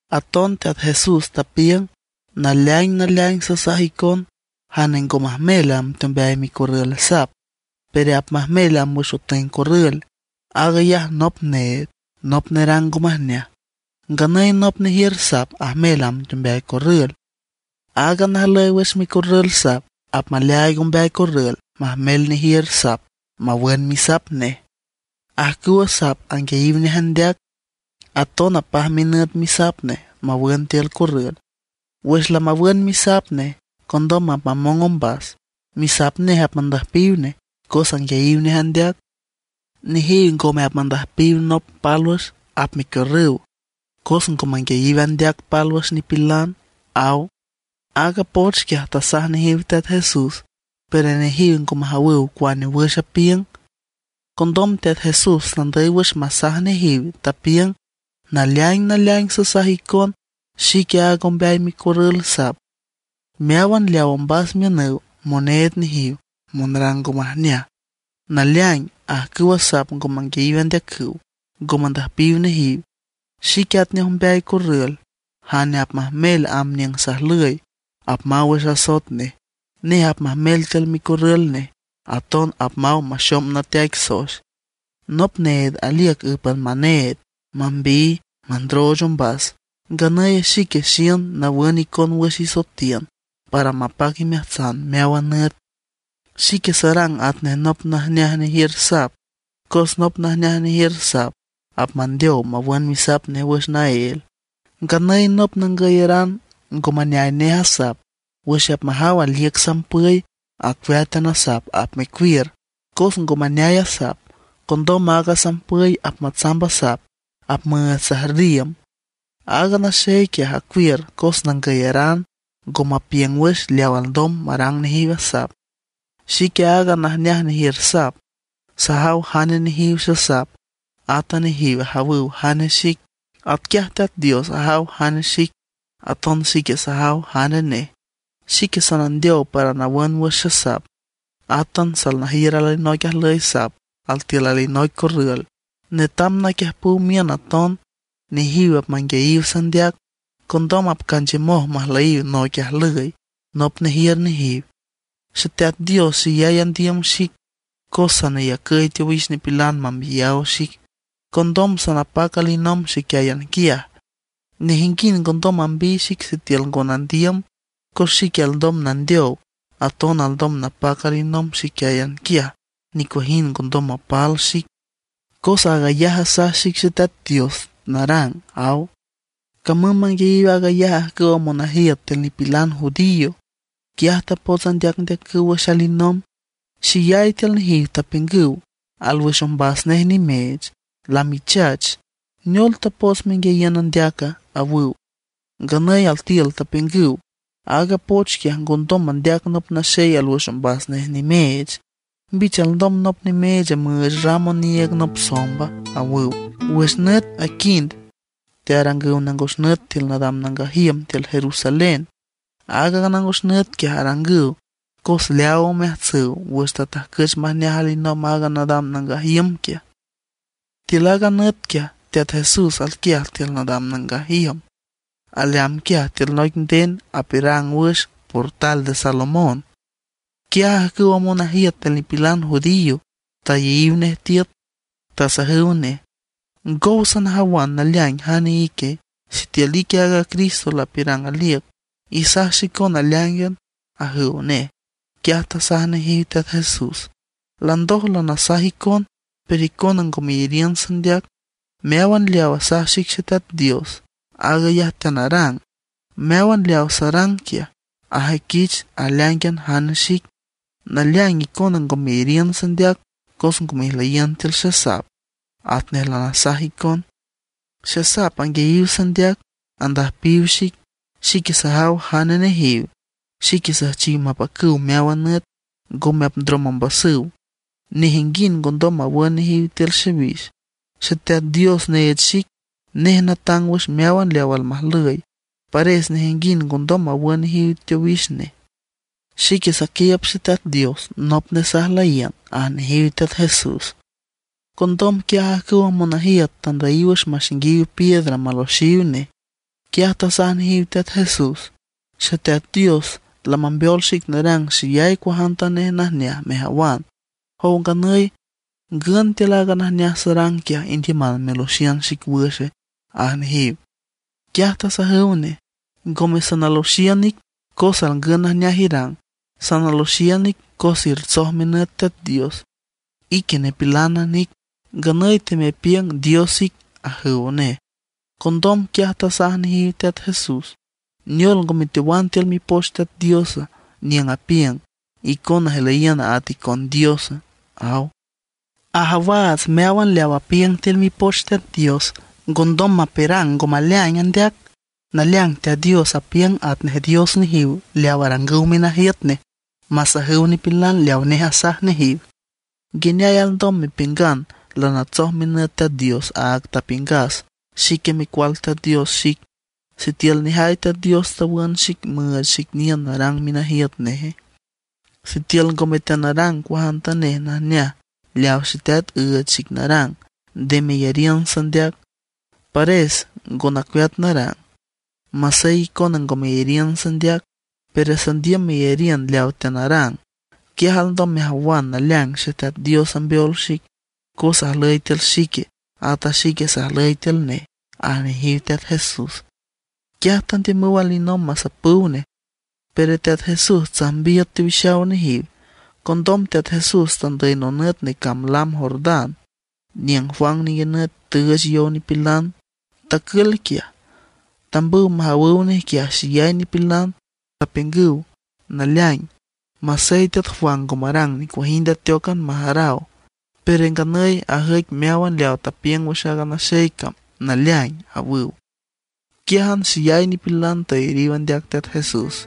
Aton Teat Jesús tapiüng: ―Naleaing naleaing sasaj icon, jane ngo majmel amb teombeay micorrül sap, pero apmajmel amb wüx otüeng corrül, aag ayaj nop need, nop nerang ngo majneaj. Nganüy nop nejiür sap ajmel amb teombeay corrül. Aaga najlüy wüx micorrül sap apmaleaaig ombeay corrül majmel nejiür sap mawün misap nej. Ajcüwa sap anguiayiw nej andeac, aton apaj minüt misap nej mawün tiül corrül. Wüx lamawün misap nej, condom apmamong ombas, misap nej apmandüjpiw nej, cos anguiayiw nej andeac. Nejiw ngome apmandüjpiw nop pálwüx, apmecuiürrüw cos ngo manguiayiw andeac pálwüx nipilan ―aw. Aaga poch quiaj tasaj nejiw Teat Jesús, pero nejiw ngo majawüw cuane wüx apiüng. Condom Teat Jesús tandüy wüx masaj nejiw, tapiüng: ―Naleaing naleaing sasaj icon: Xique aaga ombeay micorrül sap. Meáwan leawa ombas miünüw, moneed nejiw, monrang ngo majneaj. Naleaing ajcüwa sap ngo manguiayiw andeacüw, ngo mandüjpiw nejiw. Xique atnej ombeay corrül; jane apmajmel amb niüng sajlüy apmaw wüx asoet nej. Nej apmajmel tiül micorrül nej, aton apmaw maxom nateaic soex. ’Nop need aliüc ǘpan maneed, mambiy, mandrooch ombas. Nganüy xique xiün nawün icon wüx isoetiün para mapac imeajtsan meáwan nüt. Xique sarang atnej nop najneaj nejiür sap, cos nop najneaj nejiür sap apmandeow mawün misap nej wüx naél. Nganüy nop nangüyaran ngo maneay nej a sap, wüx apmajaw aliüc sampüy acueátan a sap apmecuiür, cos ngo maneay a sap. Condom aaga sampüy apmatsamb a sap, apmüüch sajrriüm. Aaga naxey quiaj acuiür cos nangüyaran, ngo mapiüng wüx leaw alndom marang nejiw a sap. ’Xique aaga najneaj nejiür sap. Sajaw jane nejiw xesap, ata nejiw ajawüw jane xic. Atquiaj Teat Dios ajaw jane xic, aton xique sajaw jane nej. Xique sanandeow para nawün wüx xesap. Átan salnajiür alinoic ajlüy sap tiül alinoic corrül, netam naquiüjpüw miün aton. Nejiw apmanguiayiw sandeac; condom apcanchiümoj majlüyiw noic ajlüy, nop nejiür nejiw. ’Xeteat Dios xeyay andiüm xic, cos saneyacüy teowix nipilan mambiyaw xic. Condom sanapac alinomb xiquiáyan quiaj. Nejinguind ngondom mambiy xic sitiül ngo nandiüm, cos xique alndom nandeow, aton alndom napac alinomb xiquiáyan quiaj, nicuajind ngondom mapal xic. Cos aag ayaj asaj xic Xeteat Dios narang ―aw. Camüm manguiayiw aag ayaj ajcüwa monajiüt tiül nipilan judío, quiaj tapots andeacndeacüw wüx alinomb. Xeyay tiül nejiw tapiüngüw: ―Alwüx ombas nej nimeech, lamichach. ¿Neol tapots menguiayiün andeaca? ―awüw. Nganüy altiül tapiüngüw: ―Aaga poch quiaj ngondom mandeac nop naxey alwüx ombas nej nimeech. ¿Mbich alndom nop nimeech müüch ram oniiüg nop somba? ―awüw. Wüx nüt aquind tearangüw nangos nüt tiül nadam nangaj iüm tiül Jerusalén. Aaga nangos nüt quiaj arangüw cos leaaw omeajtsüw wüx tatajcüch majneaj alinomb aaga nadam nangaj iüm quiaj. Tiül aaga nüt quiaj Teat Jesús alquiaj tiül nadam nangaj iüm; aleamb quiaj tiül noic nden apiürang wüx Portal de Salomón. Quiaj ajcüwa monajiüt tiül nipilan judío tayeyiw nej tiüt, tasajüw nej: ―¿Ngow sanajawan naleaing jane ique? Sitiül ique aaga Cristo lapiürang aliüc, isaj xicon aleáingan ―ajüw nej. Quiaj tasaj nejiw Teat Jesús: ―Landoj lanasaj icon, pero icona ngo meyariün sandeac. Meáwan leaw asaj xic Xeteat Dios, aag ayaj teanarang. Meáwan leaw sarang quiaj, ajüiquich aleáingan jane xic. Naleaing icona ngo meyariün sandeac cos ngo mejlüyiün tiül xesap, atnej lanasaj icon. Xesap anguiayiw sandeac, andüjpiw xic; xique sajaw jane nejiw. Xique süjchiw mapacüw meáwan nüt, ngome apndrom ombasüw; nejinguind ngondom mawün nejiw tiül xiwix. Xeteat Dios neech xic, nej natang wüx meáwan leaw almajlüy; pares nejinguind ngondom mawün nejiw teowix nej. Xique saquiiüb Xeteat Dios, nop nej sajlüyiün ―aj nejiw Teat Jesús. Condom quiaj ajcüwa monajiüt tandüyiw wüx maxainguiw piedras maloxiw nej. Quiaj tasaj nejiw Teat Jesús: ―Xeteat Dios lamambeol xic narang xeyay cuajantanej najneaj mejawan. Jow nganüy ¿ngün tiül aaga najneaj sarang quiaj indiüman meloxiün xic wüxe? ―aj nejiw. Quiaj tasajüw nej: ―Ngome sanaloxiün ic cos alngün najneaj irang, sanaloxiün cos ertsoj minüt Teat Dios. Ique nipilánan ic, nganüy temepiüng Dios ic ―ajüw nej. Condom quiaj tasaj nejiw Teat Jesús: ―¿Neol ngo meteowan tiül Mipoch Teat Dios? niüng apiüng: “Icona ijlüyiün at icon dios”, aw. Ajawaats meáwan leaw apiüng tiül Mipoch Teat Dios ngondom mapiürang ngo maleaing andeac. Naleaing Teat Dios apiüng atnej dios nejiw leaw arangüw minajiüt nej masajüw nipilan leaw nej asaj nejiw. ¿Nguineay alndom mepiüngan lanatsoj minüt Teat Dios aag tapiüngas xique Micual Teat Dios xic, sitiül nejay Teat Dios tawün xic müüch xic niün narang minajiüt neje? Sitiül ngome teanarang cuajantanej najneaj leaw Xeteat üüch xic narang, nde meyariün sandeac. Pares ngo nacueat narang, masey icona ngo meyariün sandeac, pero sandiüm meyariün leawa teanarang. Quiaj alndom mejawan naleaing Xeteat Dios ambeol xic, cos ajlüy tiül xique, ata xique sajlüy tiül nej ―aj nejiw Teat Jesús. Quiaj tandiümüw alinomb masapüw nej; pero Teat Jesús tsajmbiüt teowixaw nejiw. Condom Teat Jesús tandüy nonüt necamb lam Jordán niüng Juan ninguinüt tüüch yow nipilan. Tacül quiaj. Tambüw majawüw nej quiaj xeyay nipilan, tapiüngüw: ―Naleaing, masey teat Juan ngo marang nicuajind ateócan majaraw, pero nganüy ajüic meáwan leaw tapiüng wüx aaga naxey cam naleaing ―awüw. Quiájan xeyay nipilan tayariw andeac Teat Jesús.